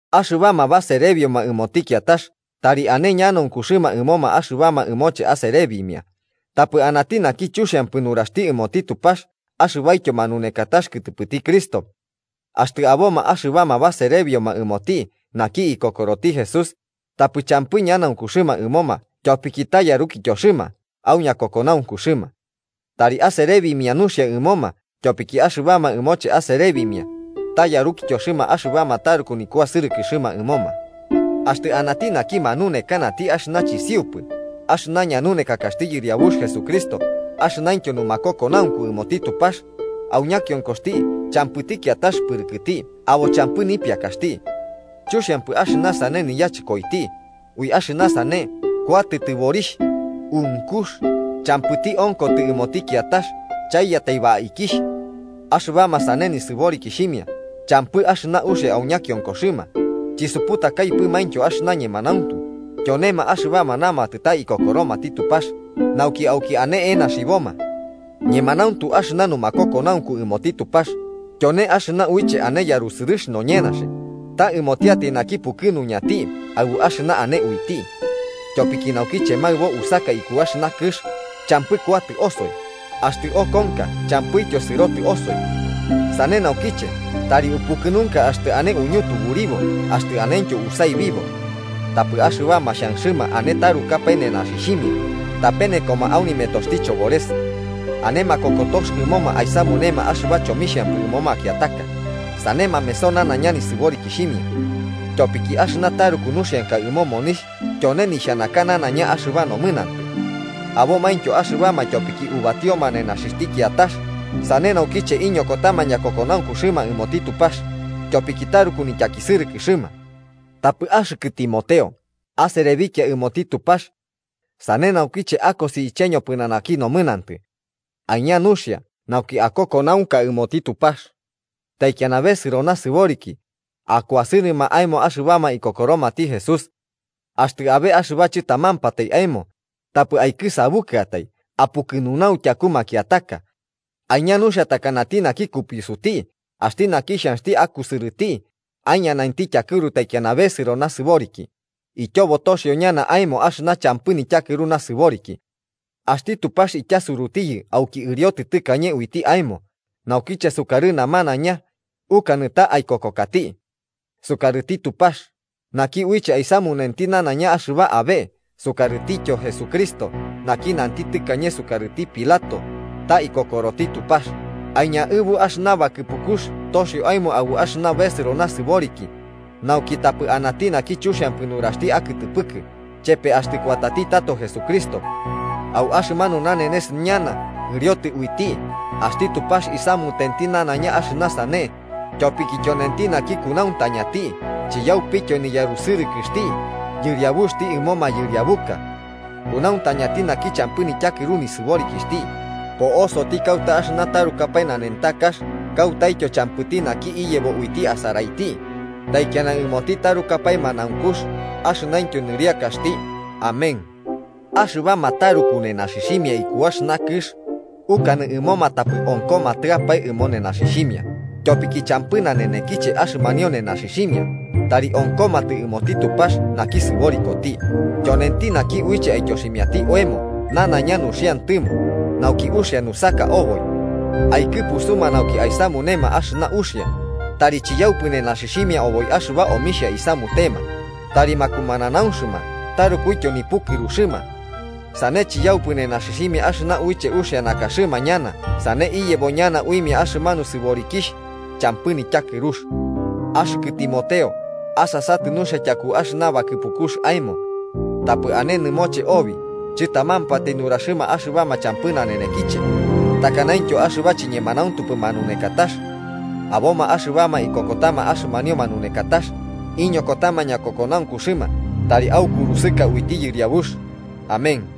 Axɨbama baserebioma ɨmoti kiatax tari ane ñanaunkuxɨma ɨmoma axɨbama ɨmoche aserebimia, tapɨ anati naki chuxiampɨ nuraxti ɨmoti Tupax axɨbaityo manunekatax kɨtɨpɨti Cristo. Axtɨ aboma axɨbama baserebioma ɨmoti naki ikokoroti Jesús, tapɨ champɨ ñanaunkuxɨma ɨmoma tyopiki ta yarukityoxɨma au ñakokonaunkuxɨma. Tari aserebimia nuxia ɨmoma tyopiki axɨbama ɨmoche aserebimia, ta yarukityoxɨma axɨbama taruku nikuasɨrɨkɨxɨma ɨmoma. Axtɨ anati naki manunekanati axɨna chisiupɨ axɨna ñanunekakaxti Yɨriabux Jesucristo axɨnaintyo numakokonaunku ɨmoti Tupax, au ñakionkoxti champɨti kiatax pɨrɨkɨti abo champɨ nipiakaxti. Chuxiampɨ axɨna sane niyachɨkoiti, ui axɨna sane kuatɨ tɨborixh, unkux, champɨti onkotɨ ɨmoti kiatax chaiyatai baikixh. Axɨbama sane nisɨborikixhimia champɨ axɨna uxia au ñakionkoxɨma chisuputakaipɨmaintyo axɨna ñemanauntu, tyonema axɨbama namatɨ ta ikokoromati Tupax nauki auki ane enaxiboma. Ñemanauntu axɨna numakokonaunku ɨmoti Tupax tyone axɨna uiche ane yarusɨrɨx noñenaxi, ta ɨmotiatai naki pukɨnuñanti aɨbu axɨna ane uiti. Tyopiki naukiche maɨbo usaka iku axɨna kɨx, champɨ kuatɨ osoi, axtɨ okonka champɨityo sɨrobotɨ osoi. Sane naukiche tari upukɨnunka axtɨ ane uñutuburibo axtɨ anentyo usaibibo. Tapɨ axɨbama xhanxɨma ane tarukapae nenaxixhimia tapenekoma au nimetoxti chobores. Ane makokotox ɨmoma aisamunema axɨba chomixhampɨ ɨmo makiataka, sane mameso nanaiña nisɨborikixhimia. Tyopiki axɨna taruku nuxianka ɨmo monixh tyone nixhanaka nanaiña axɨba nomɨnantɨ. Abomaintyo axɨbama tyopiki ubatioma nenaxixhti kiatax sane naukiche iñokotama ñakokonaunkuxɨma ɨmoti Tupax, tyopiki taruku nityakisɨrɨkɨxɨma. Tapɨ axɨkɨ Timoteo, aserebikia ɨmoti Tupax. Sane naukiche akosi iche ñopɨnanaki nomɨnantɨ. Aiña nuxia nauki akokonaunka ɨmoti Tupax. Taikiana besɨro nasɨboriki, akuasɨrɨma aemo axɨbama ikokoromati Jesús. Axtɨ abe axɨba chɨtamampatai aemo, tapɨ aikɨsabukɨatai apukɨnunau tyaku makiataka. Aiña nuxia takanati naki kupiusuti axti naki xhanxti akusɨrɨti aiñanainti tyakɨru taikiana besɨro nasɨboriki, ityobo toxio ñana aemo axɨna champɨ nityakɨru nasɨboriki. Axti Tupax ityasurutiyɨ auki ɨriotɨ tɨkañe uiti aemo naukiche sukarɨ namanaiña ukanɨ ta aikokokati. Sukarɨti Tupax, naki uiche aisamunenti nanaiña axɨba abe, sukarɨtityo Jesucristo, naki nanti tɨkañe sukarɨti Pilato ta ikokoroti Tupax, aiñaɨbu axɨna bakɨpukux toxio aemo aɨbu axɨna besɨro nasɨboriki nauki tapɨ anati naki chuxiampɨ nuraxti akɨtɨpɨkɨ, chepe axtɨ kuatati tato Jesucristo. Au axɨmanu nanenes ñana ɨriotɨ uiti, axti Tupax isamutenti nanaiña axɨna sane, tyopiki tyonenti naki kunauntañati chiyaupityo niyarusɨrɨkɨxti Yɨriabuxti ɨmo mayɨriabuka. Kunauntañati naki champɨ nityakɨru nisɨborikixhti, po'osoti kauta axɨna tarukapae nanentakax kautaityo champɨti naki iyebo uiti asaraiti. ¡Taikiana ɨmoti tarukapae manaunkux axɨnaintyo nɨriakaxti! Amén. Axɨbama taruku nenaxixhimia iku axɨna kɨx, ukanɨ ɨmoma tapɨ onkomatɨapae ɨmo nenaxixhimia, tyopiki champɨ nanenekiche axɨmanio nenaxixhimia tari onkomatɨ ɨmoti Tupax naki sɨborikoti, tyonenti naki uiche aityoximiati oemo nanaiña nuxiantɨmo, nauki uxia nusaka oboi. Aikɨpusuma nauki aisamunema axɨna uxia, tari chiyaupɨ nenaxixhimia oboi axɨbama omixhia isamutema, tari makumananaunxɨma tarukuityo nipukɨruxɨma. Sane chiyaupɨ nenaxixhimia axɨna uiche uxia nakaxɨma ñana, sane iyebo ñana uimia axɨmanu sɨborikixh champɨ nityakɨrux. Axɨkɨ Timoteo, asasatɨ nuxia tyaku axɨna bakɨpukux aemo. Tapɨ ane nɨmoche obi chɨtamampatai nuraxɨma axɨba champɨ nanenekiche, takanaintyo axɨba chiñemanauntupɨ manunekatax. Aboma axɨbama ikokotama axɨmanio manunekatax, iñokotama ñakokonaunkuxɨma Tari aukurusɨka uiti Yɨriabux. Amén.